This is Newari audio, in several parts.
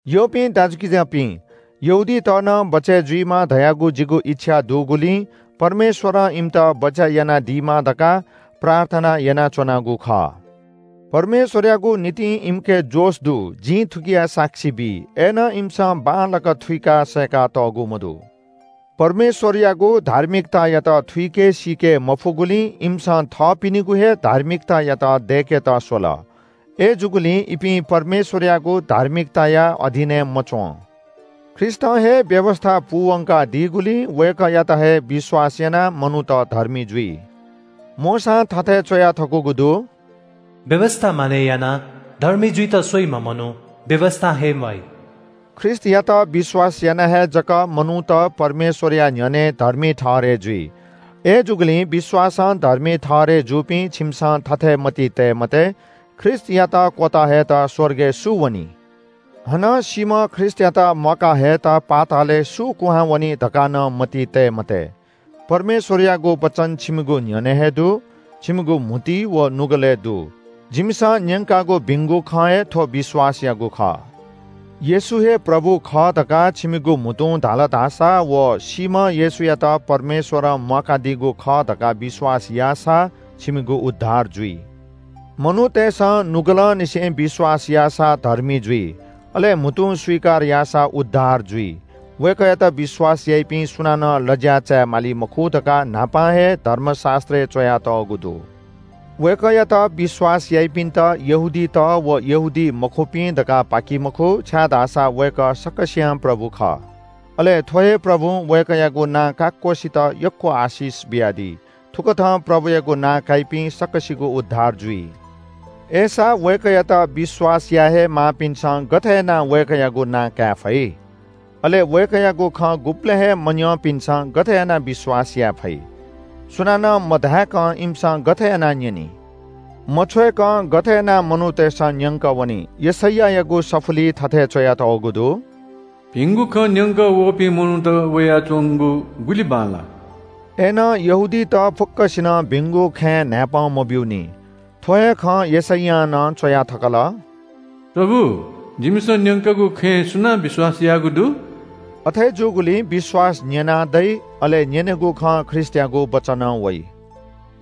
यःपिं दाजुकिजापिं, यहूदीत नं बचय् जुइमा धयागु जिगु इच्‍छा दुगुलिं परमेश्‍वरं इमित बचय् यानादीमा धकाः प्रार्थना यानाच्‍वनागु खः। परमेश्‍वरयागु निंतिं इमिके जोश दु जिं थुकिया साक्षी बी। अय्‌नं इमिसं बांलाक थुइका सय्‌कातःगु मदु। परमेश्‍वरयागु धार्मिकतायात थुइके सीके मफुगुलिं इमिसं थःपिनिगु हे धार्मिकतायात दय्‌केत स्‍वल। अय्‌जूगुलिं इपिं परमेश्‍वरयागु धार्मिकताया अधीनय् मच्‍वं। ख्रीष्‍टं हे व्‍यवस्‍था पूवंका दीगुलिं वय्‌कःयात हे विश्‍वास यानाः मनूत धर्मी जुइ। मोशां थथे च्‍वया थकूगु दु – “व्‍यवस्‍था मानय् यानाः धर्मी जुइत स्‍वइम्‍ह मनू व्‍यवस्‍थां हे म्‍वाइ।” ख्रीष्‍टयात विश्‍वास याना हे जक मनूत परमेश्‍वरया न्‍ह्यःने धर्मी ठहरय् जुइ। अय्‌जूगुलिं विश्‍वासं धर्मी ठहरय् जूपिं छिमिसं थथे मतिइ तये मते – “ख्रीष्‍टयात क्‍वत हयेत स्‍वर्गय् सु वनी?” हानं “सीम्‍ह ख्रीष्‍टयात म्‍वाका हयेत पातालय् सु क्‍वहां वनी?” धकाः नं मतिइ तये मते। परमेश्‍वरयागु वचन छिमिगु न्‍ह्यःने हे दु, छिमिगु म्‍हुतुइ व नुगलय् दु। जिमिसं न्‍यंकागु भिंगु खँ हे थ्‍व विश्‍वासयागु खः। येशू हे प्रभु खः धकाः छिमिगु म्‍हुतुं धाल धाःसा व सीम्‍ह येशूयात परमेश्‍वरं म्‍वाकादीगु खः धकाः विश्‍वास याःसा छिमिगु उद्धार जुइ। मनूतय्‌सं नुगलंनिसें विश्‍वास याःसा धर्मी जुइ, अले म्‍हुतुं स्‍वीकार याःसा उद्धार जुइ। वय्‌कःयात विश्‍वास याइपिं सुनानं लज्‍या चाय् माली मखु धकाः न्‍हापां हे धर्मशास्‍त्रय् च्‍वयातःगु दु। वय्‌कःयात विश्‍वास याइपिन्‍त यहूदीत व यहूदीमखुपिं धकाः पाकी मखु, छाय्‌धाःसा वय्‌कः सकसियां प्रभु खः। अले थ्‍व हे प्रभुं वय्‌कःयागु नां काक्‍वसित यक्‍व आशिष बियादी। थुकथं प्रभुयागु नां काइपिं सकसिगु उद्धार जुइ। अय्‌सा वय्‌कःयात विश्‍वास या हे मयाःपिन्‍सं गथे यानाः वय्‌कःयागु नां काये फइ? अले वय्‌कःयागु खँ गुबलें हे मन्‍यंपिन्‍सं गथे यानाः विश्‍वास याये फइ? सुनानं मधाय्‌कं इमिसं गथे यानाः न्‍यनी? मछ्वय्‌कं गथे यानाः मनूतय्‌सं न्‍यंकः वनी? यशैयायागु सफुलिइ थथे च्‍वयातःगु दु – “भिंगु खँ न्‍यंक वःपिं मनूत वयाच्‍वंगु गुलि बांलाः।” अय्‌नं यहूदीत फुक्‍कसिनं भिंगु खँय् न्‍हाय्‌पं मब्‍यूनि। थ्‍व हे खँ यशैयां नं च्‍वया थकल – “प्रभु, जिमिसं न्‍यंकागु खँय् सुनां विश्‍वास याःगु दु?” अथे जूगुलिं विश्‍वास न्‍यनाः दइ, अले न्‍यनेगु खँ ख्रीष्‍टयागु वचनं वइ।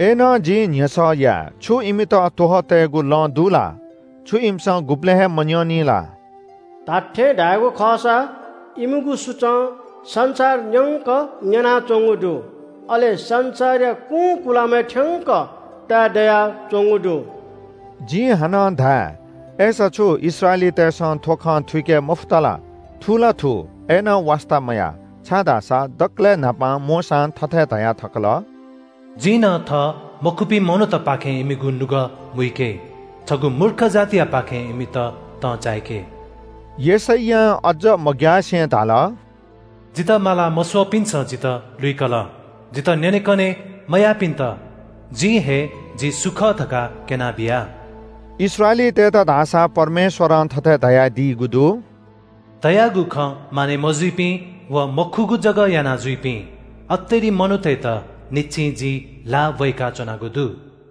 अय्‌नं जिं न्‍ह्यसः याये – छु इमित त्‍वहः तयेगु लँ दु ला? छु इमिसं गुबलें हे मन्‍यंनि ला? “धात्‍थें धायेगु खःसा इमिगु सुचं संसार न्‍यंक न्‍यनाच्‍वंगु दु। अले संसारया कुंकुलामय् थ्‍यंक ताये दयाच्‍वंगु दु।” जिं हानं धाये – अय्‌सा छु इस्राएलीतय्‌सं थ्‍व खँ थुइके मफुत ला? थु ला थू, अय्‌नं वास्‍ता मयाः, छाय्‌धाःसा दकलय् न्‍हापां मोशां थथे धया थकल – “जिं नं थः मखुपिं मनूतपाखें इमिगु नुगः मुइके, छगू मूर्ख जातियापाखें इमित तं चाय्‌के।” यशैयां अज्‍ज मग्‍यासे धाल – “जितः माला मस्‍वःपिन्‍सं जितः लुइकल। जितः न्‍यनेकने मयाःपिन्‍त जिं हे जि सु खः धकाः क्‍यनाबिया।” इस्राएलीतय्‌त धाःसा परमेश्‍वरं थथे धाःगु दु – “धयागु खँ मानय् मजुइपिं व मखुगु जक यानाजुइपिं अतेरि मनूतय्‌त न्‍हिच्‍छि जिं ल्‍हाः ब्‍वय्‌काच्‍वनागु दु।”